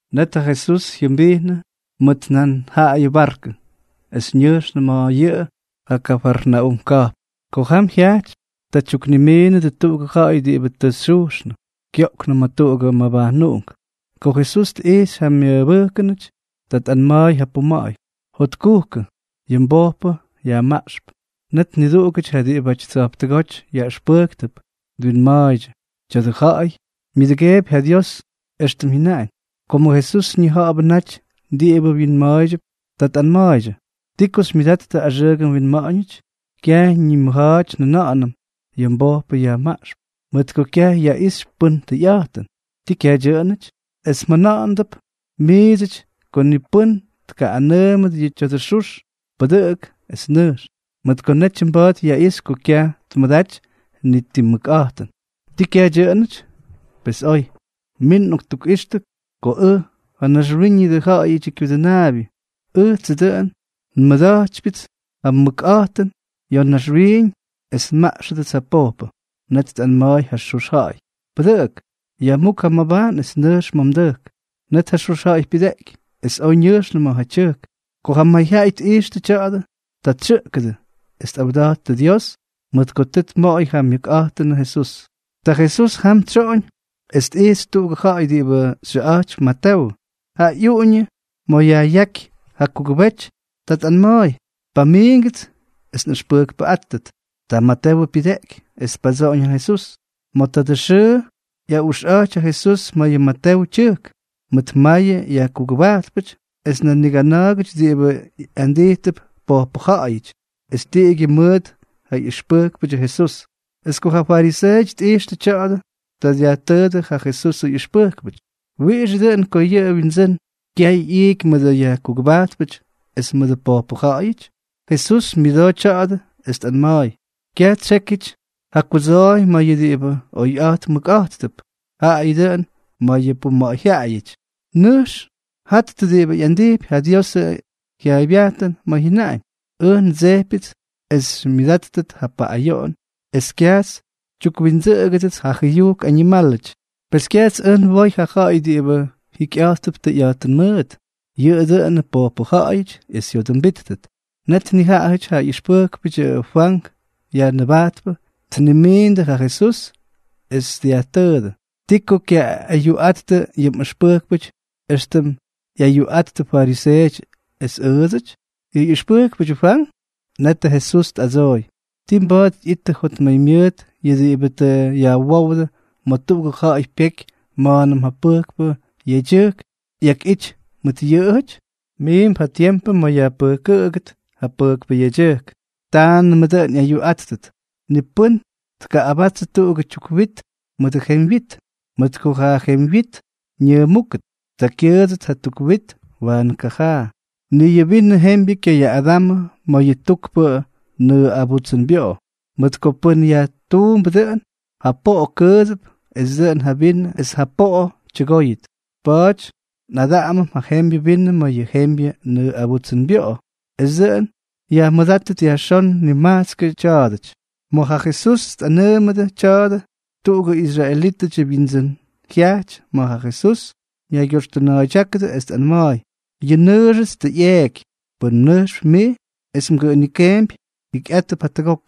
Net ja Jesús jyʉmbijnʉ mʉt nan jaꞌayʉ barkʉ, es ñʉjxnʉ ma̱ yʉꞌʉ ja Kafarnaúm ka̱jpn. Ko jam jyajty, ta tyuknimiinʉdʉ tuꞌugʉ ja̱ꞌa̱y diꞌibʉ tʉ xyujxnʉ, kyoꞌknʉ ma̱ tuꞌugʉ mabajnuꞌunk. Ko Jesús tꞌijxy ja myʉbʉjkʉnʉty, ta tꞌanma̱a̱y ja puma̱ꞌa̱y: —Jotkujkʉ. Yʉ mbojpʉ yajmaꞌxp. Net niduꞌugʉty ja diꞌibʉty tsa̱jptʉgóty yaꞌʉxpʉjktʉp twinma̱a̱ydyʉ: “Tya̱dʉ ja̱ꞌa̱y myʉdʉgeepy ja Dios éxtʉm jyʉnaꞌañ.” Komʉ Jesús ñija̱ꞌa̱bʉ naty diꞌibʉ wyinma̱a̱ydyʉp, ta tꞌanma̱a̱ydyʉ: —¿Ti ko xymyʉdattʉ axʉʉgʉ winma̱ꞌa̱ñʉty? Kyaj ñimʉja̱a̱ty njʉna̱ꞌa̱nʉm: “Yʉ mbojpʉ yajmaꞌxp”, mʉt ko kyaj yaꞌixy pʉn tʉyꞌa̱jtʉn. ¿Tii kyaj dyʉꞌʉnʉty? Es mjʉna̱ꞌa̱ndʉp miidsʉty ko ni pʉ́n tkaꞌꞌanʉʉmʉt yʉ tya̱dʉ xux: “Pʉdʉꞌʉk, es nʉjx”, mʉt ko netyʉ mba̱a̱t yaꞌixy ko kyaj tmʉdaty ni ti mʉkꞌa̱jtʉn. ¿Tii kyaj dyʉꞌʉnʉty? Pes oy. Min nꞌoktukꞌixtʉ ko ʉj, ja Naxwíñʉdʉ Ja̱ꞌa̱yʉdyʉ Kyudʉnaabyʉ, ʉjtsʉ dʉꞌʉn nmʉda̱jtypyʉts ja mʉkꞌa̱jtʉn ya̱ naxwiiñ es nmaꞌxʉdʉts ja pojpʉ. Net tꞌanma̱a̱y ja xux ja̱ꞌa̱y: —Pʉdʉꞌʉk. Yajmúk ja mmabajn es nʉjx ma̱ mdʉjk. Net ja xux ja̱ꞌa̱y pyʉdeꞌky es oj ñʉjxnʉ ma̱ ja tyʉjk. Ko ja mayjyaꞌay tꞌijxtʉ tya̱a̱dʉ, ta tsyʉꞌkʉdʉ es tꞌawda̱jttʉ Dios mʉt ko tʉ tmoꞌoy ja myʉkꞌa̱jtʉnʉ Jesús. Ta Jesús jam tsyoꞌoñ es tꞌijxy tuꞌugʉ ja̱ꞌa̱y diꞌibʉ xyʉꞌa̱jtypy Matewʉ, ja ꞌyuꞌuñʉ ma̱ yajꞌyáky ja kugʉbety. Ta tꞌanma̱a̱y: —Pamiingʉts es nꞌʉxpʉjkpʉꞌátʉt. Ta Matewʉ pyʉdeꞌky, es tpadsoꞌoñ ja Jesús. Ma̱ tadʉ xʉʉ ꞌyaꞌuxꞌa̱jty ja Jesús ma̱ yʉ Matewʉ tyʉjk, mʉt mayʉ yajkugʉbajtpʉty es nan nigana̱a̱gʉty diꞌibʉ ꞌyandijtʉp pojpʉ ja̱ꞌa̱yʉty, es tiꞌigyʉ mʉt ja ꞌyʉxpʉjkpʉdyʉ Jesús. Es ko ja fariseeʉty tꞌijxtʉ tya̱a̱dʉ, ta dyajtʉʉdʉ ja Jesusʉ ꞌyʉxpʉjkpʉty: —¿Wiꞌixʉ dʉꞌʉn ko yʉ mwindsʉ́n kyay ꞌyiiky mʉdʉ yajkugʉbajtpʉty es mʉdʉ pojpʉ ja̱ꞌa̱yʉty? Jesús myʉdoo tya̱a̱dʉ, es tꞌanma̱a̱y: —Kyaj tsyékyʉty ja kudsooy ma̱ yʉ diꞌibʉ oyꞌa̱jt mʉkꞌa̱jttʉp, jaayʉ dʉꞌʉn ma̱ yʉ puma̱ꞌa̱yjyaꞌayʉty. Nʉjx jattʉ diꞌibʉ ꞌyandijpy ja Diosʉ jyaaybyajtʉn ma̱ jyʉnaꞌañ: “Ʉj ndsejpyʉts es xymyʉdáttʉt ja paꞌꞌayoꞌon, es kyajts xytyukwindsʉꞌʉgʉdʉts ja jʉyujk añimálʉty.” ’Pes kyajts ʉj nwoy ja ja̱ꞌa̱y diꞌibʉ jikyꞌa̱jttʉp tʉyꞌa̱jtʉn mʉʉt, yʉꞌʉ dʉꞌʉnʉ pojpʉ ja̱ꞌa̱yʉty es jyodʉmbíttʉt. Net nijaꞌajʉty ja ꞌyʉxpʉjkpʉdyʉ Fwank Yajnʉbajtpʉ tnimiindʉ ja Jesús, es dyajtʉʉdʉ: —¿Ti ko kyaꞌꞌayuꞌattʉ yʉ mꞌʉxpʉjkpʉty éxtʉm ꞌyayuꞌattʉ fariseeʉty es ʉʉdsʉty, yʉ ꞌyʉxpʉjkpʉdyʉ Fwank? Netʉ Jesús tꞌadsooy: —¿Tii mba̱a̱t ꞌyittʉ jotmaymyʉʉt yʉ diꞌibʉ tʉ yajwówdʉ ma̱ tuꞌugʉ ja̱ꞌa̱y pyeky ma̱a̱nʉm ja pʉjkpʉ yedyʉjk ꞌyakꞌity mʉt yʉꞌʉjʉty? Miimp ja tiempʉ ma̱ yajpʉjkʉdʉt ja pʉjkpʉ yedyʉjk, taanʉmʉ dʉꞌʉn ꞌyayuꞌáttʉt. ’Ni pʉ́n tkaꞌꞌabatsʉ tuꞌugʉ tyuk wit mʉdʉ jemywyit, mʉt ko ja jemywyit ñʉʉmúkʉt, ta kyʉʉdsʉt ja tuk wit waanʉ kajaa. Ni yʉ vinʉ jembyʉ kyayaꞌꞌadamʉ ma̱ yʉ tukpʉ nʉʉꞌabutsʉnbyoꞌo, mʉt ko pʉn yajtuumbʉ dʉꞌʉn, ja poꞌo kʉʉdsʉp, es dʉꞌʉn ja vinʉ es ja poꞌo tyʉgóyʉt. Pa̱a̱ty nꞌadaꞌamʉm ja jembyʉ vinʉ ma̱ yʉ jembyʉ nʉʉꞌabutsʉnbyoꞌo es dʉꞌʉn yajmʉdátʉt yajxón nimajtskʉ tya̱a̱dʉty. Ma̱ ja Jesús tꞌanʉʉmʉdʉ tya̱a̱dʉ, tuꞌugʉ israelítʉdyʉ wyindsʉ́n jyajty ma̱ ja Jesús, ñaygyoxtʉna̱a̱ydyákʉ es tꞌanma̱a̱y: —Yʉ nnʉʉxʉts tʉ ꞌyeeky. Pʉn mnʉjxp mij es mgʉꞌʉnikeempy, jikyꞌátʉp jatʉgok.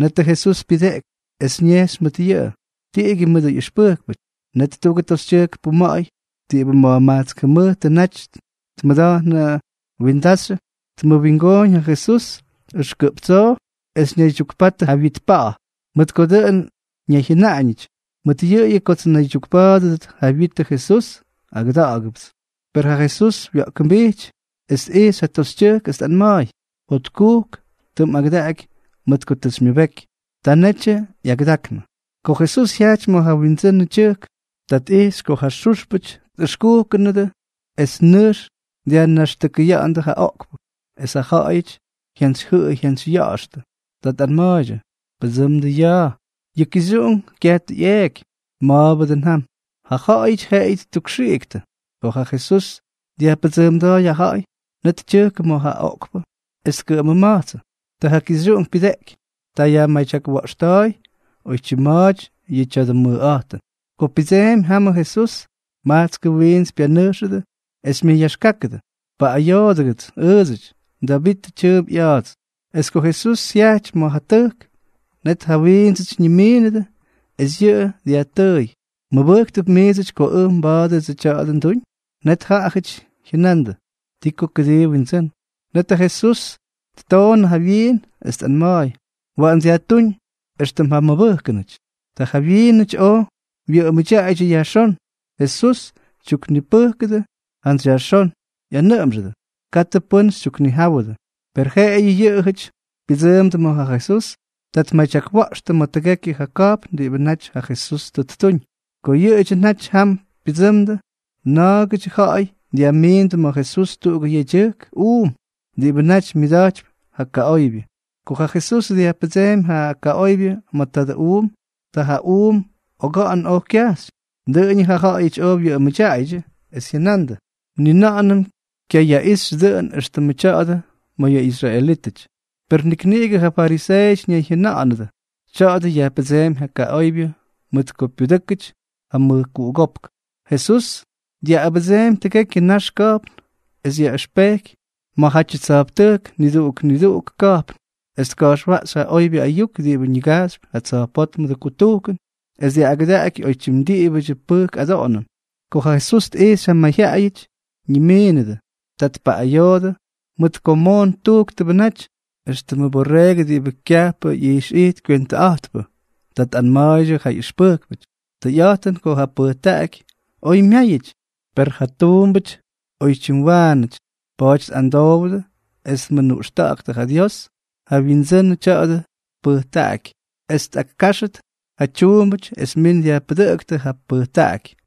Netʉ Jesús pyʉdeꞌky es ñejxy mʉt yʉꞌʉ, tiꞌigyʉ mʉdʉ ꞌyʉxpʉjkpʉty. Net tuꞌugʉ toxytyʉjk puma̱ꞌa̱y diꞌibʉ ma̱jmajtsk jʉmʉjtʉ naty tmʉda̱jnʉ windaxyʉ, tmʉwingooñ ja Jesús ʉxkʉꞌp tsoo, es ñaydyukpatʉ ja wyit pa̱ꞌa̱, mʉt ko dʉꞌʉn ñayjyʉnaꞌañʉty: “Mʉt yʉꞌʉyʉ kots nnaydyukpa̱a̱dʉdʉt yʉ wyitʉ Jesús, agʉda̱ꞌa̱gʉpts.” Per ja Jesús wa̱ꞌkʉmbijt, tꞌijxy ja toxytyʉjk es tꞌanma̱a̱y: —Jotkujk, tʉ mꞌagʉdaꞌaky mʉt ko tʉ xymyʉbeky. Ta netyʉ ꞌyagʉdaknʉ. Ko Jesús jyajty ma̱ ja windsʉnʉ tyʉjk, ta tꞌijxy ko ja xúxpʉty tꞌʉxkujkʉnʉdʉ es nʉjx dyajnaxtʉkʉyánʉdʉ ja oꞌkpʉ, es ja ja̱ꞌa̱yʉty jyantsyjyʉꞌʉy jyantsyya̱ꞌa̱xtʉ. Ta tꞌanma̱a̱ydyʉ: —Pʉdsʉmdʉ ya̱a̱. Yʉ kixyuꞌunk kyaj tʉ ꞌyeeky. Ma̱a̱bʉ dʉn jam. Ja ja̱ꞌa̱yʉty jeꞌeyʉ ttukxiꞌiktʉ. Ko ja Jesús dyajpʉdsʉʉmda̱a̱y ja ja̱ꞌa̱yʉty, net tyʉjkʉ ma̱ ja oꞌkpʉ es tkʉꞌʉmʉma̱jtsʉ. Ta ja kixyuꞌunk pyʉdeꞌky. Ta yajmadyakwa̱ꞌxta̱a̱y oymya̱a̱ty yʉ tya̱dʉ mʉjꞌa̱jtʉn. Ko pyʉdseemy jamʉ Jesús, majtskʉ wiints pyanʉjxʉdʉ es myʉyaxkákʉdʉ: —¡Paꞌꞌayoodʉgʉts ʉʉdsʉty, Davitʉ tyʉʉmp ꞌya̱a̱ts! Es ko Jesús jyajty ma̱ ja tʉjk, net ja wiindsʉty ñimiinʉdʉ, es yʉꞌʉ dyajtʉʉy: —¿Mmʉbʉjktʉp miidsʉty ko ʉj mba̱a̱dʉdsʉ tya̱a̱dʉ nduñ? Net jaꞌajʉty jyʉnandʉ: —Ti ko kʉdii, Windsʉ́n. Net ja Jesús ttoonʉ ja wyiin, es tꞌanma̱a̱y: —Waꞌan dyajtúñ éxtʉm ja mmʉbʉjkʉnʉty. Ta ja wyiinʉty oj wyʉꞌʉmda̱a̱ydyʉ yajxón. Jesús tyuknipʉjkʉdʉ jantsy yajxón, ꞌyanʉꞌʉmxʉdʉ: —Katʉ pʉ́n xytyuknijáwʉdʉ. Per jeꞌeyʉ yʉꞌʉjʉty pyʉdsʉʉmdʉ ma̱ ja Jesús, ta tmadyakwa̱ꞌxtʉ ma̱ tʉgekyʉ ja ka̱jpn diꞌibʉ naty ja Jesús tʉ ttuñ. Ko yʉꞌʉdyʉ naty jam pyʉdsʉmdʉ, na̱a̱gʉdyʉ ja̱ꞌa̱y dyajmiindʉ ma̱ Jesús tuꞌugʉ yedyʉjk uum, diꞌibʉ naty myʉda̱jtypy ja kaꞌoybyʉ. Ko ja Jesús dyajpʉdseemy ja kaꞌoybyʉ ma̱ tadʉ uum, ta ja uum oga̱ꞌa̱n oj kyajxy. Dʉꞌʉñʉ ja ja̱ꞌa̱yʉty oj wyʉꞌʉmʉdyaaydyʉ, es jyʉnandʉ: —¡Ni na̱ꞌa̱nʉm kyayaꞌixy dʉꞌʉn éxtʉmʉ tya̱a̱dʉ ma̱ yʉ israelítʉty! Per nik niꞌigʉ ja fariseeʉty ñayjyʉna̱ꞌa̱nʉdʉ: —Tya̱a̱dʉ yajpʉdseempy ja kaꞌoybyʉ mʉt ko pyudʉ́kʉty ja mʉjkuꞌugópk. Jesús dyaꞌꞌabʉdseemy tʉgekyʉ nax ka̱jpn, es yaꞌʉxpejky ma̱jatyʉ tsa̱jptʉjk niduꞌuk niduꞌugʉ ka̱jpn, es tka̱jxwaꞌxy ja oybyʉ ayuk diꞌibʉ ñigajxypy ja tsa̱jpótmʉdʉ kutujkʉn, es dyaꞌꞌagʉdaꞌaky oytyim diꞌibʉdyʉ pʉjk adoꞌonʉn. Ko ja Jesús tꞌijxy ja mayjyaꞌayʉty ñimínʉdʉ, ta tpaꞌꞌayoodʉ, mʉt ko moon tujktʉbʉ naty éxtʉmʉ borreegʉ diꞌibʉ kyajpʉ ꞌyijxꞌijt kywentʉꞌa̱jtpʉ. Ta tꞌanma̱a̱ydyʉ ja ꞌyʉxpʉjkpʉty: —Tʉyꞌa̱jtʉn ko ja pʉjtaꞌaky oy myáyʉty, per ja tuumbʉty oytyim waanʉty. Pa̱a̱ty amdowdʉ es mʉnuꞌxta̱ꞌa̱ktʉ ja Dios, ja ñiWindsʉnʉ tya̱dʉ pʉjtaꞌaky, es tꞌakkáxʉt ja tuumbʉty es min dyajpʉdʉꞌʉktʉ ja pʉjtaꞌaky.